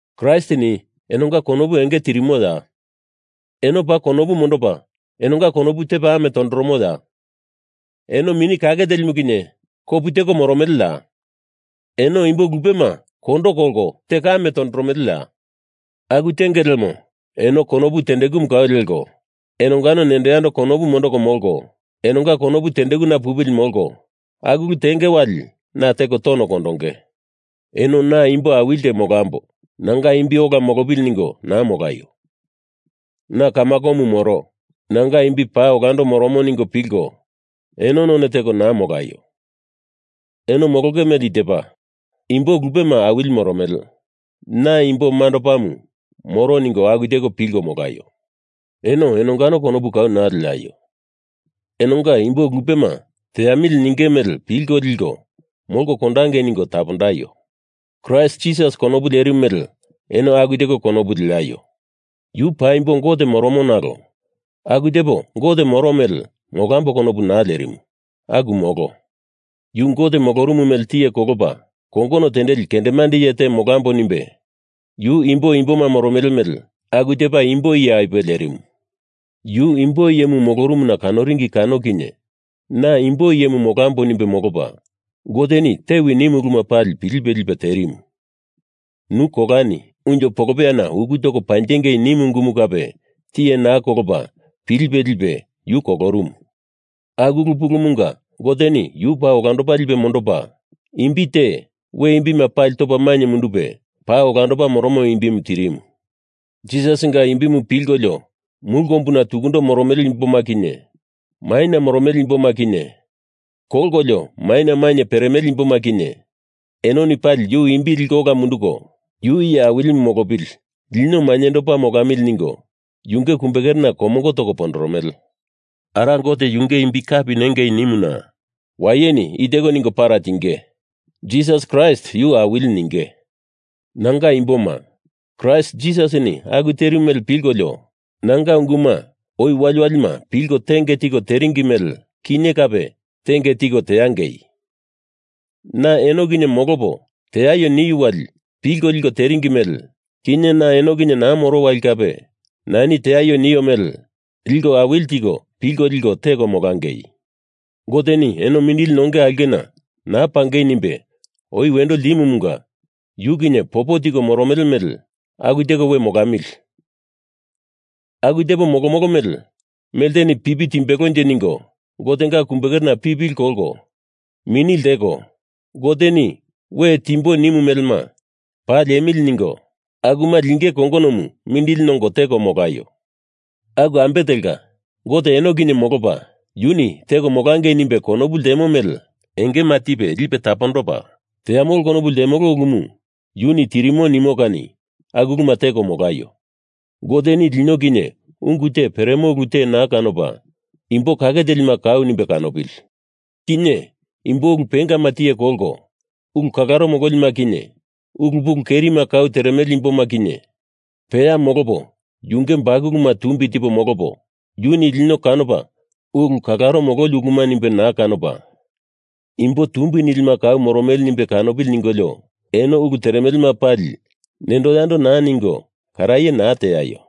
Kraistini enonga konopu enge tirimoya? Eno paa konopu mondopa enonga konopu tepa ame tondoromoya? Eno Mini Kake Telimu kinye kopu teko moromeleya? Eno imbo lupema kondo kolko teko ame tondoromeleya? Aku tenge lemo eno konopu tendekumu kau leko, enongano nendo yando konopu mondoko molko, enonga konopu tendekuna pupili molko aku ulu tenge wali na teko tono kondonge. Eno na imbo awili te molambo, nanga imbi ola molopili ningo naa molaio. Na kamakomu moro, nanga imbi paa olando moromo ningo pilko eno none teko naa molaio. Eno molonge mele i tepa, imbo lupema awili moromele, na imbo mandopamu moro ningo aku teko pilko molaio. Eno enongano konopu kau naa leaio. Enonga imbo lupema teamili ninge mele pilko liko molko kondangei ningo tapondaio. Kraist Jisasi konopu lerimu mele eno aku teko konopu leaio. Yu paimbo Gote moromo nalo aku tepo Gote moro mele molambo konopu naa lerimu. Aku molo. Yu Gote molorumu mele tiye kolopa kongono tendeli kendemande iye te molambo nimbe yu imbo imboma moromele mele aku tepa imbo iye apuwe lerimu. Yu imbo iyemu molorumuna kanoringi kano kinye na imbo iye molambo nimbe molopa, Goteni tewi nimu uluma pali pilipe lipe terimu. Nu kolani, unjo polopeyana uku toko panjengei nimu ungumu kape tiye naa kolopa pilipe lipe yu kolorumu. Aku ulu pulumunga Goteni yu paa olandopa lipe mondopa, imbi te we imbima pali topa mainye mundupe paa olandopa moromo imbimu tirimu. Jisasinga imbimu pilkolio mulu kombuna tukundo moromele imboma kinye, maina moromele imboma kinye, kolkolio maina mainye peremele imboma kinye, enoni pali yu imbi liko ola munduko, Yu iye Awilimu molopili lino mainyendopa molamili ningo yunge kumbekerena komongo toko pondoromele. Ara Gote yunge imbi kapi nengei nimuna wayeni i teko ningo para tinge. Jisas Kraist yu Awili ninge. Nanga imboma, Kraist Jisasini aku terimu mele pilkolio nanga unguma oi waliwalima pilko tenge tiko teringi mele, kinye kape tenge tiko teangei. Na eno kinye molopo teaio niu wali pilko liko teringi mele, kinye na eno kinye naa moro wali kape nani teaio nio mele liko awili tiko pilko liko teko molangei. Goteni eno mindili nonge aulkena naa pangei nimbe oi wendo ltimumunga yu kinye popo tiko moromele mele aku tepo we molamili, aku tepo molomolo mele melteni pipi timbelonje ningo Gotenga kumbekerena pipili kolko mini lteko Goteni we timbo nimu melema paa liemili ningo akuma lingei kongonomu mindili nongo teko molaio. Aku ambe telka, Gote eno kinye molopa, yuni teko molangei nimbe konopu ltemo mele teangei nimbe engema tipe lipe tapondopa, teamolo konopu ltemele ulumu yuni tirimo nimo kani aku uluma teko molaio. Goteni lino kinye ungu te peremo ulu, te naa kanopa, imbo kake telima kau nimbe kanopili. Kinye imbo ulu pengama tiye kolko ulu kalaro mololima kinye ulu pulu kerima kau teremele imboma kinye peya molopo yunge bakuluma tumbi tipo molopo yuni lino kanopa ulu kalaro mololi uluma nimbe naa kanopa imbo tumbi nilima kau moromele nimbe kanopili ningolio eno ulu teremelema pali nendo yando naa ningo karaye naa teaio.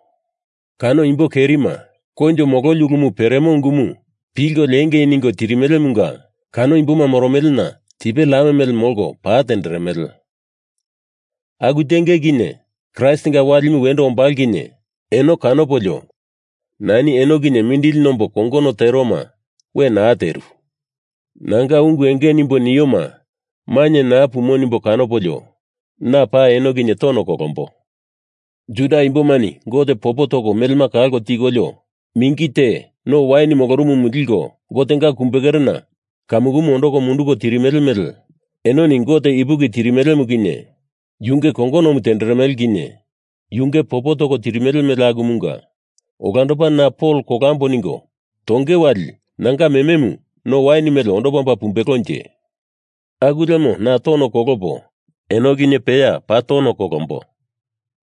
Kano imbo kerima koinjo mololi ulumu peremo ungumu pilko liengei ningo tirimelemunga kano imboma moromelena tipe lam mele molko pa tenderemele. Aku tenge kinye, Kraistinga walimu wendo ombalo kinye eno kanopolio nani eno kinye mindili nombo kongono teroma we naa teru. Nanga ungu enge nimbo nioma mainye naa pumo nimbo kanopolio na paa eno kinye tono kolombo. Juda imbomani Gote popo toko melema kalko tikolio, mingi te no wain moromomu liko Gotenga kumbekerena kamukumu ondoko munduko tirimele mele enoni Gote ipuki tirimelemu kinye, yunge kongonomu tenderemele kinye, yunge popo toko tirimele mele akumunga olandopa na Pol kolambo ningo tongei wali nanga mememu no wain mele ondopa omba pumbelonje. Aku lemo na tono kolopo, eno kinye peya paa tono kolombo.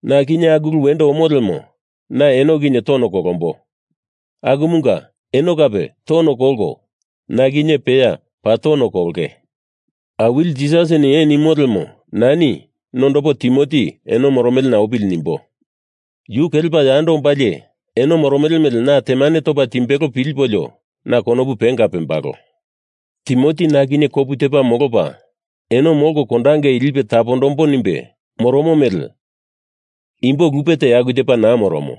Na kinye aku ulu wendo omo lemo na eno kinye tono kolombo, akumunga eno kape tono kolko na kinye peya paa tono kolonge. Awili Jisasini ee nimo lemo nani nondopo Timoti eno moromelena opili nimbo. Yu kelepa yando ombalie eno moromele mele na temane topa timbelo pilipolio na konopu penga pembalo. Timoti na kinye kopu tepa molopa eno molko kondangei lipo tapondombo nimbe moromo mele imbo lupe te aku tepa naa moromo.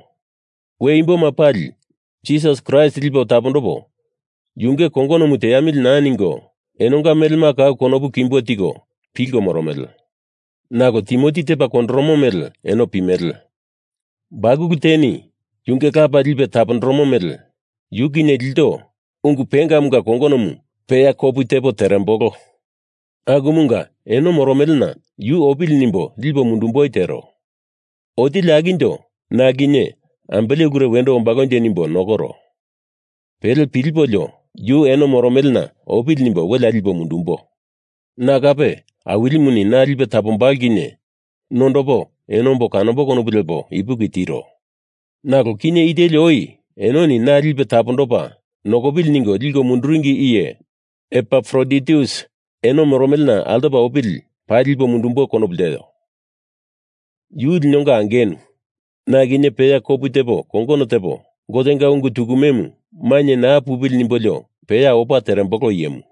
We imboma pali Jisas Kraist lipo tapondopo yunge kongonomu teamili naa ningo enonga melema kau konopu kimbo tiko pilko moromele. Nalo Timoti tepa kondoromo mele eno pimele. Bakulu teni yunge lapa lipe tapondoromo mele yu kinye ilto ungu pengamunga kongonomu peya kopu tepo terembolo. Akumunga eno moromelena yu opili nimbo lipo mundumboi tero. Otili akinjo na kinye ambele ulure wendo ombalonje nimbo nokoro. Pele pilipolio, yu eno moromelena opili nimbo welea lipo mundumbo. Na kape Awilimuni na lipe tapondombalo kinye nondopo eno ombo kanombo konopu lepo ipuki tiro. Nalo kinye i teli oi enoni na lipe tapondopa nokopili ningo liko munduringi iye Epafroditus eno moromelena altopa opili paa lipo mundumbo konopu lteo. Yu linonga angenu, na kinye peya kopu tepo kongono tepo, Gotenga ungu tukumemu mainye naa pupili nimbolo peya opa terembolo iyemu.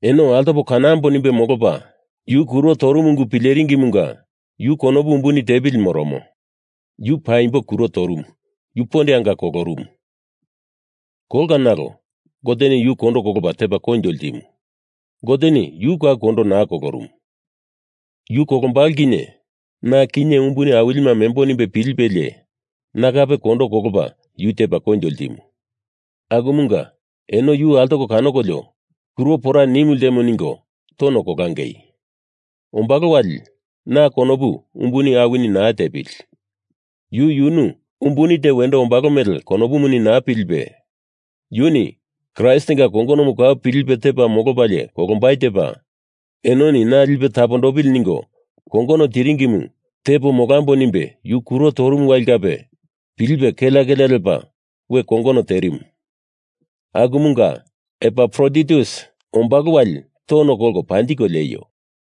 Eno altopo kanamboa nimbe molopa, yu kuro torumu ungu pileringimunga yu konopu umbuni tepili moromo. Yu paimbo kuro torumu, yu pondeanga kolorumu. Kolka nalo Goteni yu kondo kolopa tepa koinjo ltimu. Goteni yu kau kondo naa kolorumu. Yu kolombalo kinye na kinye umbuni awilima membo nimbe pilipelie na kape kondo kolopa yu tepa koinjo ltimu. Akumunga eno yu altoko kanokolio kuro pora nimu ltemo ningo tono kolangei. Ombalo wali na konopu umbuni awini naa tepili. Yu yunu umbuni te wendo ombalo mele konopuni naa pilipe, yuni Kraistinga kongonomu kau pilipe tepa molopalie kolombai tepa, enoni na lipe tapondopili ningo kongono tiringimu tepo molambo nimbe yu kuro torumu wali kape pilipe kelea kelea lepa we kongono terimu. Akumunga Epafroditus ombalo wali tono kolko panjiko lieio.